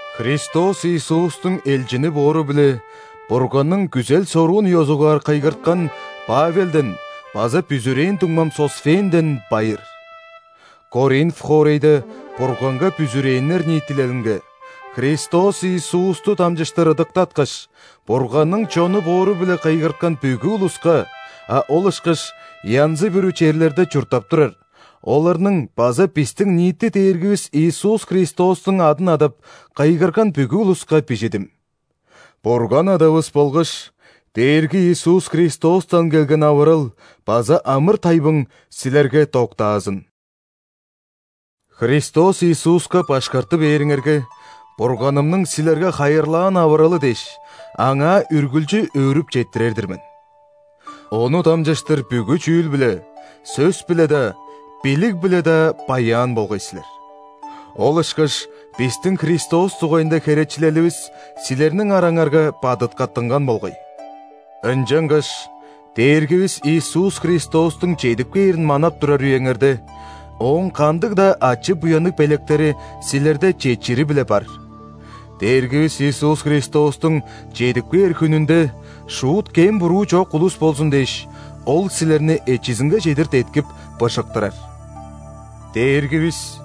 Христос Иисустуң элчини боору-биле Бурганның күзел-соруун ёзугаар кыйгырткан Павелден база бүзүрээн дуңмам Сосфенден байыр. Коринф хоорайда Бурганга бүзүрээннер ниитилелинге, Христос Иисусту дамчыштыр ыдыктаткаш, Бурганның чону боору-биле кыйгырткан бүгү улуска, а ол ышкаш янзы-бүрү черлерде чурттап турар, оларның база бистиң ниити Дээргивис Иисус Христостуң адын адап, кыйгырган бүгү улуска бижидим. Бурган Адавыс болгаш Дээрги Иисус Христостан келген авырал база амыр-тайбың силерге доктаазын! Христос Иисуска башкарты бээриңерге, Бурганымның силерге хайырлаан авыралы дээш, Аңаа үргүлчү өөрүп четтирер-дир мен. Ону дамчыштыр бүгү чүүл-биле: сөс-биле-даа, билиг-биле-даа баяан болгай силер. Ол ышкаш бистиң Христос дугайында херечилеливис силерниң араңарга бадыткаттынган болгай. Ынчангаш Дээргивис Иисус Христостуң чедип кээрин манап турар үеңерде, Ооң кандыг-даа ачы-буянныг белектери силерде четчири-биле бар. Дээргивис Иисус Христостуң чедип кээр хүнүнде шуут кем-буруу чок улус болзун дээш, Ол силерни эчизинге чедир деткип, быжыктырар. Дээргивис,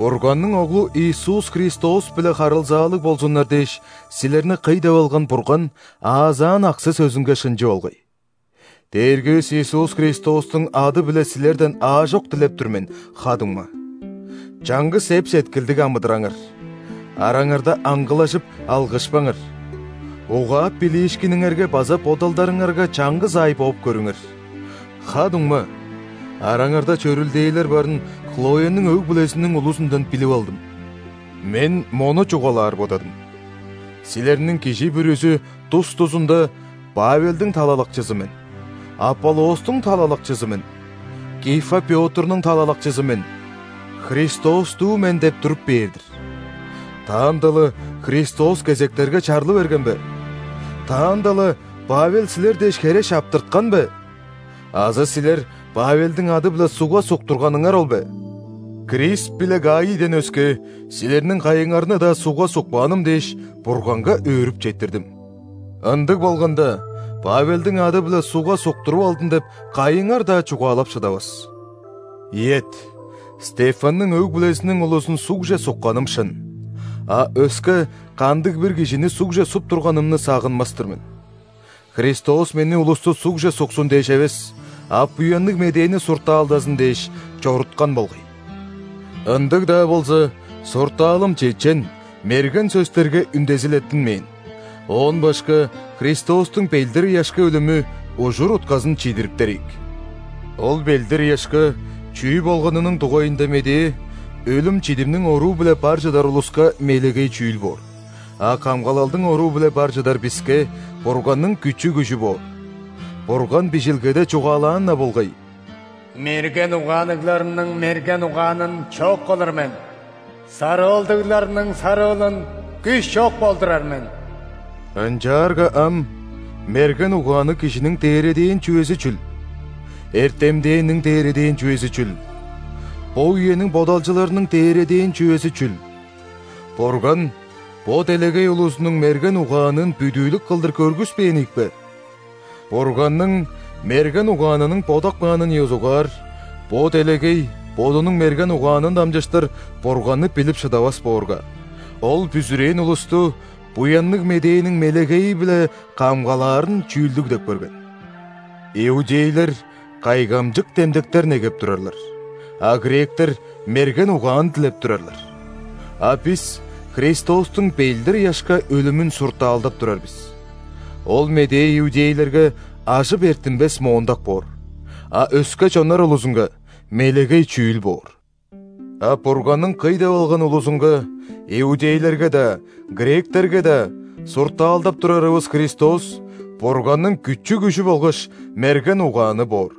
Бурганның Оглу Иисус Христос-биле харылзаалыг болзуннар дээш силерни кый деп алган Бурган аазаан аксы-сөзүнге шынчы болгай. Дээргивис Иисус Христостуң ады-биле силерден аажок дилеп тур мен, ха-дуңма: чаңгыс эп-сеткилдиг амыдыраңар, араңарда аңгылажып, алгышпаңар, угаап билиишкиниңерге база бодалдарыңарга чаңгыс аай бооп көрүңер. Ха-дуңма, араңарда чөрүлдээлер барын Хлояның өг-бүлезиниң улузундан билип алдым. Мен мону чугаалаар бодадым: силерниң кижи бүрүзү тус-тузунда «Павелдиң талалакчызы мен», «Аполлостуң талалакчызы мен», «Кифа Пётрнуң талалакчызы мен», «Христостуу мен» деп туруп бээр-дир. Таанда-ла Христос кезектерге чарлы берген бе? Таанда-ла Павел силер дээш хере шаптырткан бе? Азы силер Павелдиң ады-биле ·сугга суктурганыңар ол бе? Крисп биле Гаийден өске, силерниң кайыңарны-даа сугга сукпааным дээш, Бурганга өөрүп четтирдим. Ындыг болганда, «Павелдиң ады-биле сугга суктуруп алдым» деп, кайыңар-даа чугаалап шыдавас. (Ийет, Стефанның өг-бүлезиниң улузун ·сугже сукканым шын. А өске кандыг-бир кижини сугже суп турганымны сагынмас-тыр мен.) Христос мени улусту сугже суксун дээш эвес, а Буянныг Медээни суртаалдазын дээш, чоруткан болгай. Ындыг-даа болза, суртаалым чечен, мерген сөстерге үндезилеттинмээн, оон башка Христостуң ·белдир-ыяшка өлүмү ужур-утказын чидириптер ийик. Ол белдир-ыяшка чүү болганының дугайында медээ өлүм-чидимниң оруу-биле бар чыдар улуска мелегей чүүл боор, а камгалалдың оруу-биле бар чыдар биске – Бурганның күчү-күжү боор. Бурган Бижилгеде чугаалаан-на болгай:«Мерген угаанныгларның мерген угаанын чок кылыр мен,сарыылдыгларның сарыылын күш чок болдурар мен». Ынчаарга ам мерген угаанныг кижиниң дээредээн чүвези чүл? Эртемденниң дээредээн чүвези чүл? Бо үениң бодалчыларының дээредээн чүвези чүл? Бурган бо делегей улузунуң мерген угаанын бүдүүлүк кылдыр көргүспээн ийикпе? Бурганның мерген угаанының бодап каанын ёзугаар, бо делегей бодунуң мерген угаанын дамчыштыр Бурганны билип шыдавас боорга, Ол бүзүрээн улусту Буянныг Медээниң «мелегейи-биле» камгалаарын чүүлдүг деп көрген. Иудейлер кайгамчык демдектер негеп турарлар, а гректер мерген угаан дилеп турарлар. А бис Христостуң белдир-ыяшка өлүмүн суртаалдап турар бис. Ол медээ иудейлерге – ажып эрттинмес моондак боор, а өске чоннар улузунга – мелегей чүүл боор. А Бурганның кый деп алган улузунга (иудейлерге-даа, гректерге-даа) суртаалдап турарывыс Христос – Бурганның күчү-күжү болгаш мерген угааны боор.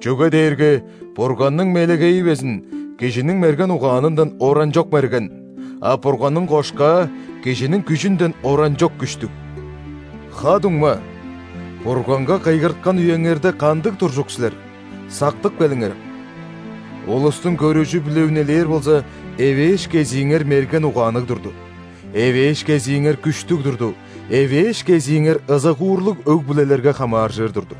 Чүге дээрге Бурганның «мелегейи» безин кижиниң мерген угаанындан оранчок мерген, а Бурганның «кошкаа» кижиниң күжүнден оранчок күштүг. Ха-дуңма, Бурганга кыйгырткан үеңерде кандыг туржук силер, сактып келиңерем. Улустуң көрүжү-биле үнелээр болза, эвээш кезииңер мерген угаанныг турду; эвээш кезииңер күштүг турду; эвээш кезииңер ызыгуурлуг өг-бүлелерге хамааржыр турду.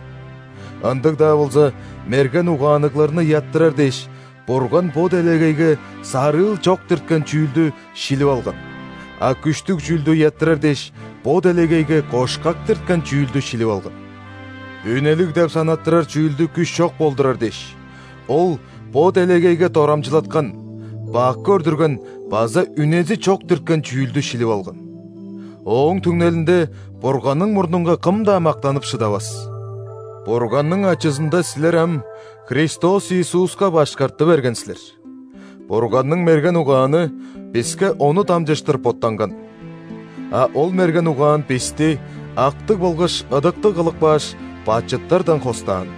Ындыг-даа болза, мерген угаанныгларны ыяттырар дээш, Бурган бо делегейге сарыыл чок дирткен чүүлдү шилип алган, а күштүг чүүлдү ыяттырар дээш, бо делегейге кошкак дирткен чүүлдү шилип алган. «Үнелиг» деп санаттырар чүүлдү күш чок болдурар дээш, Ол бо делегейге дорамчылаткан, бак көрдүрген база «үнези чок» дирткен чүүлдү шилип алган. Ооң түңнелинде Бурганның мурнунга кым-даа мактанып шыдавас. Бурганның ачызында силер ам Христос Иисуска башкарты берген силер. Бурганның мерген угааны биске Ону дамчыштыр боттанган. А ол мерген угаан бисти актыг болгаш ыдыктыг кылып кааш, бачыттардан хостаан.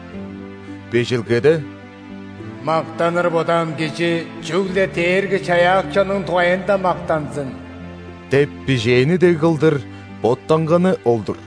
Бижилгеде: «Мактаныр бодаан кижи чүгле Дээрги-Чаяакчының дугайында мактанзын!» – деп бижээни дег кылдыр боттанганы ол-дур.